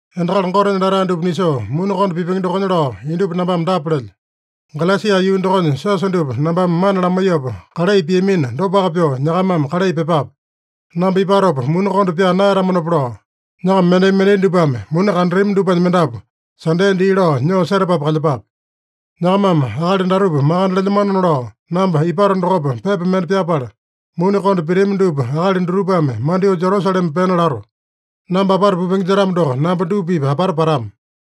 Endakali Gotenya latae dupa nisoo muni konda pipenge dokonya lao, indupa nambame dapa lelyo: Galesia yuu dokonya siosa dupa nambame mana lamaiyopa kalai piamina, dopaka pyoo nyakamame kalai pyepape. Namba ipatopa muni konda pyaa naeyatamanopa lao, nyakama mendai-mendai dupame muni kandatami dupanya mendapu, Sande dii lao nyoo setapapu kalyepape. Nyakamame akali datupa makande lelyamanona lao, namba ipato dokopa pepa mende pyapala, muni konda pitami dupa akali dutupame mandyoo Jerusalema pena lato. Namba apata pupenge jetamo doko, namba dupa-pipa apata patama.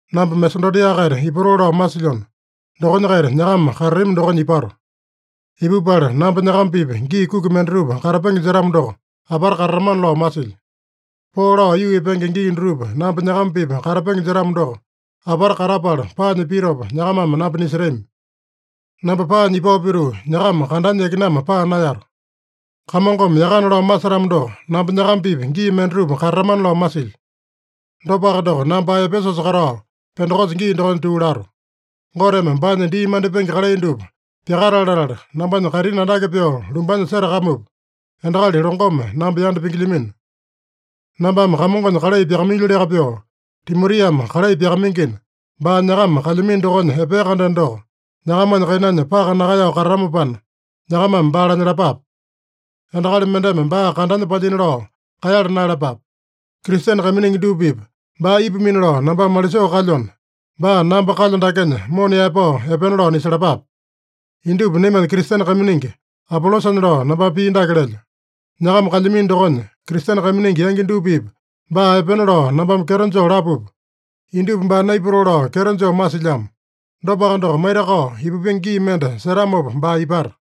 Namba Masedonia-kaita ipatoo lao masilyona, dokonya-kaita nyakama katatami dokonya ipato. Ipupala namba nyakama-pipa gii kuki mendatupa katapenge jetamo doko, apata katatamana lao masilyo. Poo lao aiyuu epenge gii dutupa namba nyakama-pipa katapenge jetamo doko, apata katapala, paanya pitopa nyakamame namba nisetami. Namba paanya ipao pituu, nyakama kandanya yakinama paa naeyato. Kamongome yakana lao masetamo doko, namba nyakama-pipa gii mendatupa katatamana lao masilyo. Dopaka doko, namba ae Epesusa katao, Pendekosa gii dokonya tuu lato. Goteme baanya dii mandipenge kalai dupa pyakatale latala, nambanya kaitini andake pyoo lumbanya setakamupa, endakali longome namba yanda pingilyamino. Nambame Kamongonya kalai pyakamailyoliaka pyoo, Timotiame kalai pyakamaingina, baa nyakama kalyamino dokonya epea-kandeno doko, nyakamanya kainanya paka nakaeyao katatamopana, nyakamame baa lanyalapape. Endakali mendeme baa kandanya palyina lao kaeyala naeyalapape. Kristene kaiminingi dupa-pipa baa ipamino lao nambame malisoo kalyona, baa namba kalyo dakenya mona yaepao epena lao nisalapape. Indupa naimanya Kristene kaiminingi Apolosanya lao nambame pii dake lelyo: Nyakama kalyamino dokonya, Kristene kaiminingi yangi dupa-pipa baa epena lao nambame kyeto joo lapupa, indupa baa naipatoo lao kyeto joo masilyamo. Dopaka doko, maitakao ipupenge gii mende setamopa baa ipata.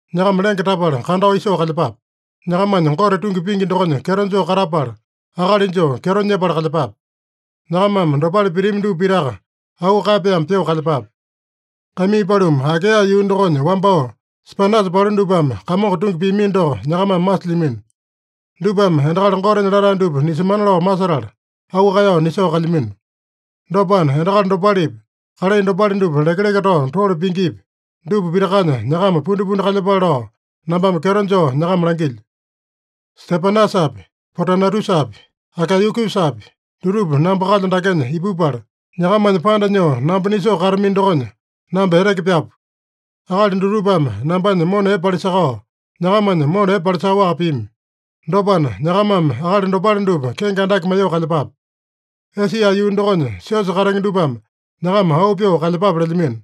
Nyakama lenge tapala kandao isoo kalyepape. Nyakamanya Gote tungi pingi dokonya kyeto joo katapala, akali joo kyeto nyepala kalyepape. Nyakamame dopale pitami dupa pitaka auu kaeyapaeme pyoo kalyepape. Kaimii paluma, Akaeya yuu dokonya wambao Stepanasa palu dupame Kamongo tungi piamino doko nyakamame masilyamino. Dupame endakali Gotenya latae dupa nisemana lao masetala, auu kaeyao nisoo kalyamino. Dopana, endakali dopalepi, kalai dopale dupa lekeleke tao tole pingipi, dupa pitakanya nyakama pundipundi kalyepale lao nambame kyeto joo nyakama langilyo. Stepanasapi, Potunatusapi, Akaeyakusapi, dutupa namba kalyo dakenya ipupala, nyakamanya panda nyoo namba nisoo katamino dokonya, namba eteke pyapu. Akali dutupame nambanya mona epe palisakao, nyakamanya mona epe palisakaowaka pimi. Dopana, nyakamame akali dopale dupa kenge andake maiyoo kalyepape. Esia yuu dokonya siosa katenge dupame nyakama auu pyoo kalyepape lelyamino.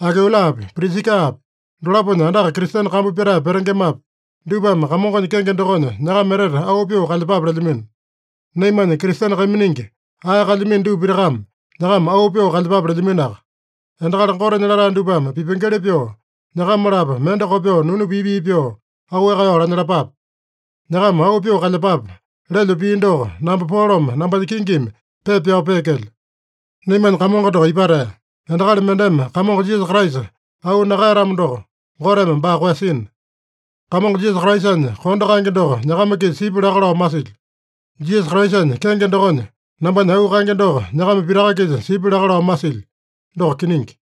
Akuilapi, Prisikapi, dolaponya andaka Kristene kambu pyatae petengemapi, dupame Kamongonya kenge dokonya nyakama etete auu pyoo kalyepape lelyamino. Naimanya Kristene kaiminingi ae kalyamino dupa pitakame nyakama auu pyoo kalyepape lelyaminoaka. Endakali Gotenya latae dupame pipengeli pyoo, nyakama-lapo mende kopyoo nunu pii-pii pyoo auu kaeyao lanyalapape. “Nyakama auu pyoo kalyepape” lelyo pii doko namba Polome nambanya kingimi pepa pyao peekelyo. Naimanya Kamongo doko ipatea! Endakali mendeme Kamongo Jisasa Kraisa auu nakaeyatamo doko, Goteme baa koeyasina. Kamongo Jisasa Kraisanya kondo kaenge doko nyakama-kisa sipya laka lao masilyo. Jisasa Kraisanya kenge dokonya, nambanya auu kaenge doko nyakama pitaka-kisa sipya laka lao masilyo. Doko kiningi.